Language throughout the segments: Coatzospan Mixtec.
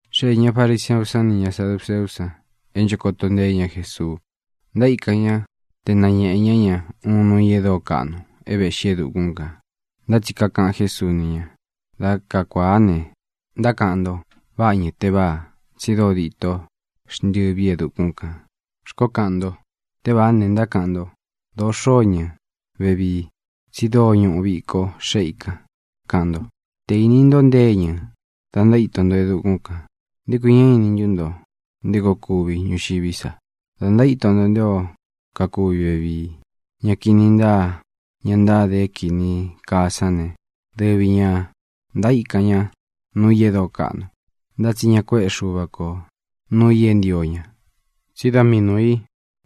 Xéē ña fariseú san nī ña saduceú san é ncho koto nteé ña Jesuu. Ntaíkan ña te nañēꞌe ñá ña uun nuu i e dóo kaꞌnu é vēꞌxí e dukún kān. Ntá tsi kakaꞌan Jésuu ni ña: —Da kakuáā ne, ntákaꞌan nto: “Váꞌa iñɨ̄ teváā, tsi dóo dito xntɨvi e dukún kan”, xkoó kaꞌan nto. Tévāá ne, ntákaꞌan nto: “Dōo xóo iñɨ̄ vevii, tsi dóo ñuꞌu viko xéꞌe i kan”, kaꞌan nto. Te īni nto nté iñɨ̄ da ntaíto nto e dukún kān, ¿nté kui ñá ini ntu nto nté koo kuvi ñuxiví sa, da ntaíto nto nté o kakuvi vevii? Ña kini ntáa, ña ntáde é kīni kaa sán ne, dɨvi ñā ntaíkan ña nuu i e dóo kaꞌnu, ntá tsi ña kuéꞌē ká Xuva ko nūu i é ntio ña, tsí da mii nūu i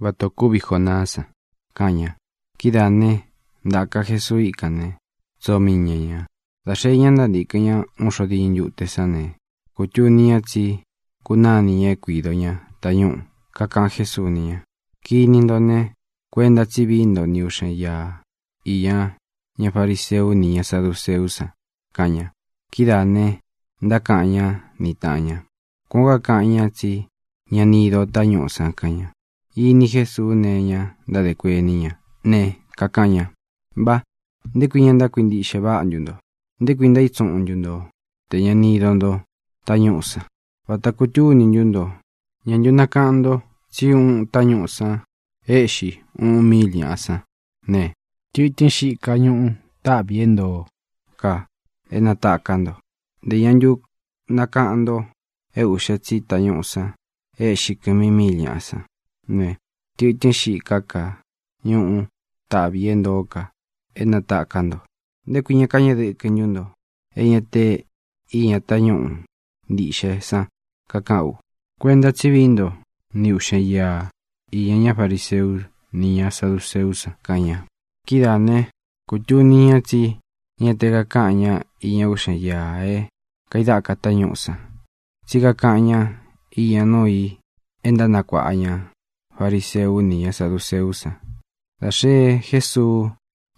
váta ō kúvi Jonaá san —kaꞌan ña. Kidáā né, ntāka Jesuu íkān né, tsoo mii ña ñā. Dā xee ñá ntántīkɨn ña uun xo diñɨ ntute sán ne, kūtuni ña tsí kunánī ña é kuīdo ña tañúꞌū. Kakaꞌan Jésuu ni ña: —Kini nto ne, kuenta tsí vií nto ni ūꞌxen íā iña ñá fariseu ni ñá saduceú san —kaꞌan ña. Kidáā ne, ntákaꞌan ñá ni tāꞌan ña: —Kuan ō kaꞌan ñá, tsi ña ni ído ō tañúꞌū san —kaꞌan ña. Īni Jesuu née iña ntádē kuení ña ne, kakaꞌan ña: —¡Mpá! ¿Nté kui ña ntákuintiꞌxe váꞌa ntu nto? ¿Nté kui ntaítsuꞌun ntu nto tē ña ni ido nto tañúꞌū san? ¿Vāta kutúni ntú nto? ¿Ñā ntu nakaꞌan nto tsí uꞌun tañúꞌū san éꞌxi uꞌun míil ñāꞌa sán ne, tɨ̄tɨ́n xiká ka ñuꞌu taꞌvi ī e ntóo ka é natāká nto? ¿Ntē ña ntu nakaꞌan nto e uꞌxe tsi tañúꞌū san e éꞌxi kɨmi míil ñāꞌa sán ne, tɨ̄tɨ́n xiká ka ñuꞌu taꞌvi ī e ntóo ka é natāká nto? ¿Nté kui ña kañeꞌe dɨkɨ ntu nto e ña te iña tañúꞌu ntīꞌxe san kakaꞌán u? Kuenta tsí vií nto ni ūꞌxen íā iña ñá fariseu ni ñá saduceú san —kaꞌan ña. Kidáā né, kūtuni ña tsí ña te kakáꞌan ña iña uꞌxen íā é kaidáka tañúꞌū san, tsí kakaꞌan ñá iña nuu i é ntánakuāꞌa ña fariseu ni ñá saduceú san. Dā xee Jésuu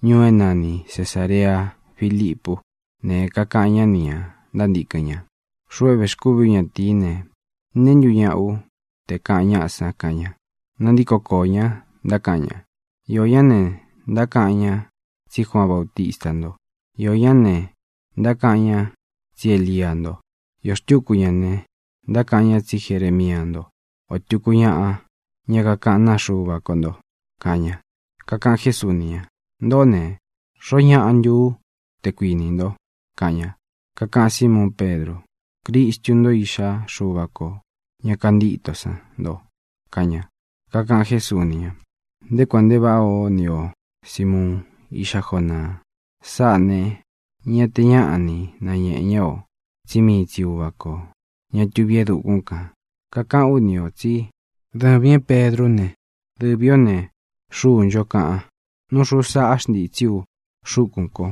ñuú é nani Cesārea Filipú ne, kakaꞌan ñá nī ña ntántīkɨn ña: —Xuꞌu é vēxkúvi ú ñatīí ne, ¿neé ntu ñaꞌa ú, te kāꞌan ñáꞌa san? —kaꞌan ña. Nantíko koō ña, ntákaꞌan ñá: —Iō ñá ne, ntákaꞌan ña tsí Juaan Bautista nto. Iō ñá ne, ntákaꞌan ña tsí Elia nto. Īo xtúku ña ne, ntákaꞌan ñá tsi Jeremia ntó, ō tuku ñaꞌa ña kakaꞌán naa Xuva ko nto —kaꞌan ña. Kakaꞌan Jésuu ni ña: —Ntōꞌó ne, ¿xoó ñaꞌa ntu ú, te kuinī nto? —kaꞌan ña. Kakaꞌan Símuun Pedru: —Cristu ntó, Iꞌxá Xuva kō ña kantíto san nto —kaꞌan ña. Kakaꞌan Jésuu ni ña: —Nté kuān nte váꞌā ó ni o, Sīmuun, iꞌxá Jonaa. Sáꞌā ne, ña te ñáꞌa ni nañēꞌe ñá o, tsí mii tsi Uvā kó, ña tuví e dukún kān. Kakaꞌán u ni ō tsí dɨvīn é Pedrú ne, dɨvī ó ne, xúu nchó kaꞌan. Nú xūu saꞌá xntītsí u xúkūn ko.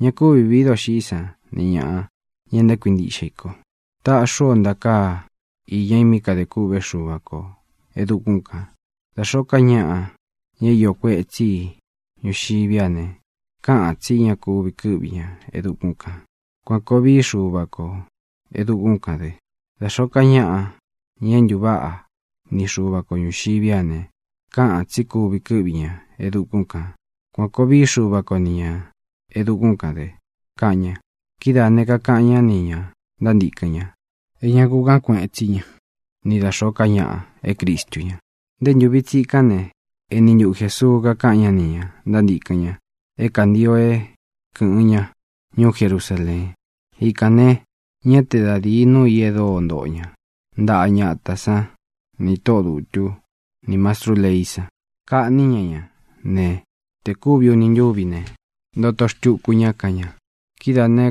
Ña kúvi vīí doxiꞌí san nī ñaꞌa, ña ntákuintiꞌxe i ko. Taꞌxí u o ntakāá iña i mí kadē kûꞌvé Xuva kō e dukún kān. Da xōó ka ñaꞌa, ña é īó kuetsí i ñuxiví a ne, káꞌān tsí ña kúvi kɨ́ꞌvi ña e dukún kān. Kuan kōo vií Xuva kō e dukún kān dɨ. Da xōó ka ñaꞌa, ña é ntuváꞌa ni Xuva ko ñuxiví a ne, káꞌān tsí kuvi kɨ́ꞌvi ña e dukún kān. Kuan kōo vií Xuva ko ni ñā e dukún kān dɨ —kaꞌan ña. Kidáā ne, kakaꞌan ñá nī ña ntántīkɨn ña é ña ku kaꞌán kueꞌen tsí ña ni da xōó ka ñaꞌa é Cristu ña. Nté ntūvi tsikán ne, eni ntuꞌu Jēsuu kakaꞌan ñá nī ña ntántīkɨn ña é kantio é kɨ̄ꞌɨn ñá ñuú Jerusaleen. Ikān ne, ñá te da dīi núu ī dóo ntoꞌo ña ntaꞌa ñatā sán nī tóꞌō dutú nī mastrú leí san. Kaꞌní ña ña ne, te kūvi uni ntúvi ne, ntoto xtuku ña, kaꞌan ña. Kidáā ne,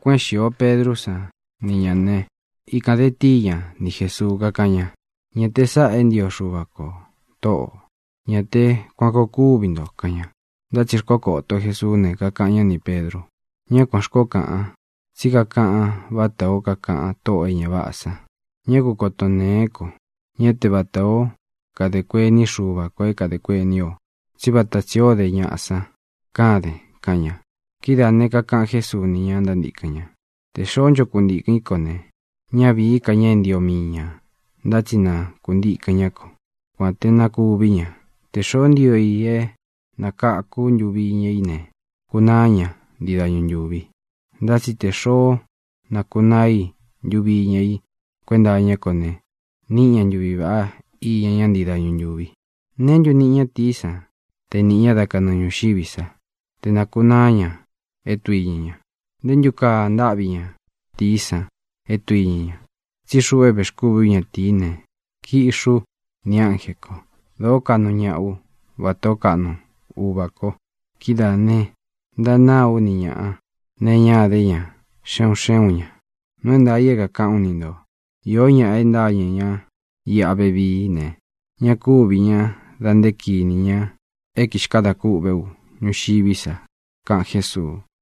kuéꞌen xīo Pedrú san ni ñā né, ikān de tíi ña ni Jēsuu, kákaꞌan ña: —Ñá te sāꞌá e ntio Xuva ko, Tóꞌō. Ñá te kuan kōo kuvi nto —kaꞌan ña. Ntá tsi xkokoto Jēsuú ne, kakaꞌan ñá nī Pedru: —¡Ñá kuān xkoó kaꞌan, tsí kakaꞌan vátā ó kakaꞌan tóꞌō e ña váꞌā san! Ñá ku koton ntēén ko. Ñá te vatā ó kade kuení Xuva kō é kadē kuení o, tsí vata tsī ó de ñaꞌa san káden —kaꞌan ña. Kidáā ne, kakaꞌan Jésuu ni ña ntántīkɨn ña: —Tē xoó ncho kuntīkɨn í ko ne, ñá vīí ka ña é ntio mii ña, ntá tsi na kuntīkɨn ñá ko, kuān te na kuví ña. Tē xoó ntio i é nakāku ntuvi iña í ne, kunaá ña ntii dañu ntūvi. Ntá tsi tē xoó nakunaa i ntuvi iña i kuenta iñá ko ne, níꞌi ña ntuvi vāꞌá iña ña ntii dañu ntúvi. ¿Neé ntu niꞌi ñatīí san te nīꞌi ña dá kanɨɨ ñūxiví sa, te nākunaá ña é tduiña ña? ¿Nté ntu kaa ntáꞌvi ñatīí san é tduiña ña? Tsí xuꞌu é vēxkúvi ú ñatīí ne, kiꞌxi ú nī ánjē ko. Dōó kaꞌnu ñaꞌa ú, vatā ó kaꞌnu Uva kō. Kidáā ne, ntanáa ú ni ñāꞌa nee iñá idé ña xé un xé un ñā. Nuu é ntaā i é kākaꞌán u ni ntō. Iō ñáꞌa e ntáñɨ̄ ñá iꞌa vevií ne, ña kúvī ñá da nté kinī ña é kixkadā kûꞌvé u ñuxiví sa —kaꞌan Jésuu.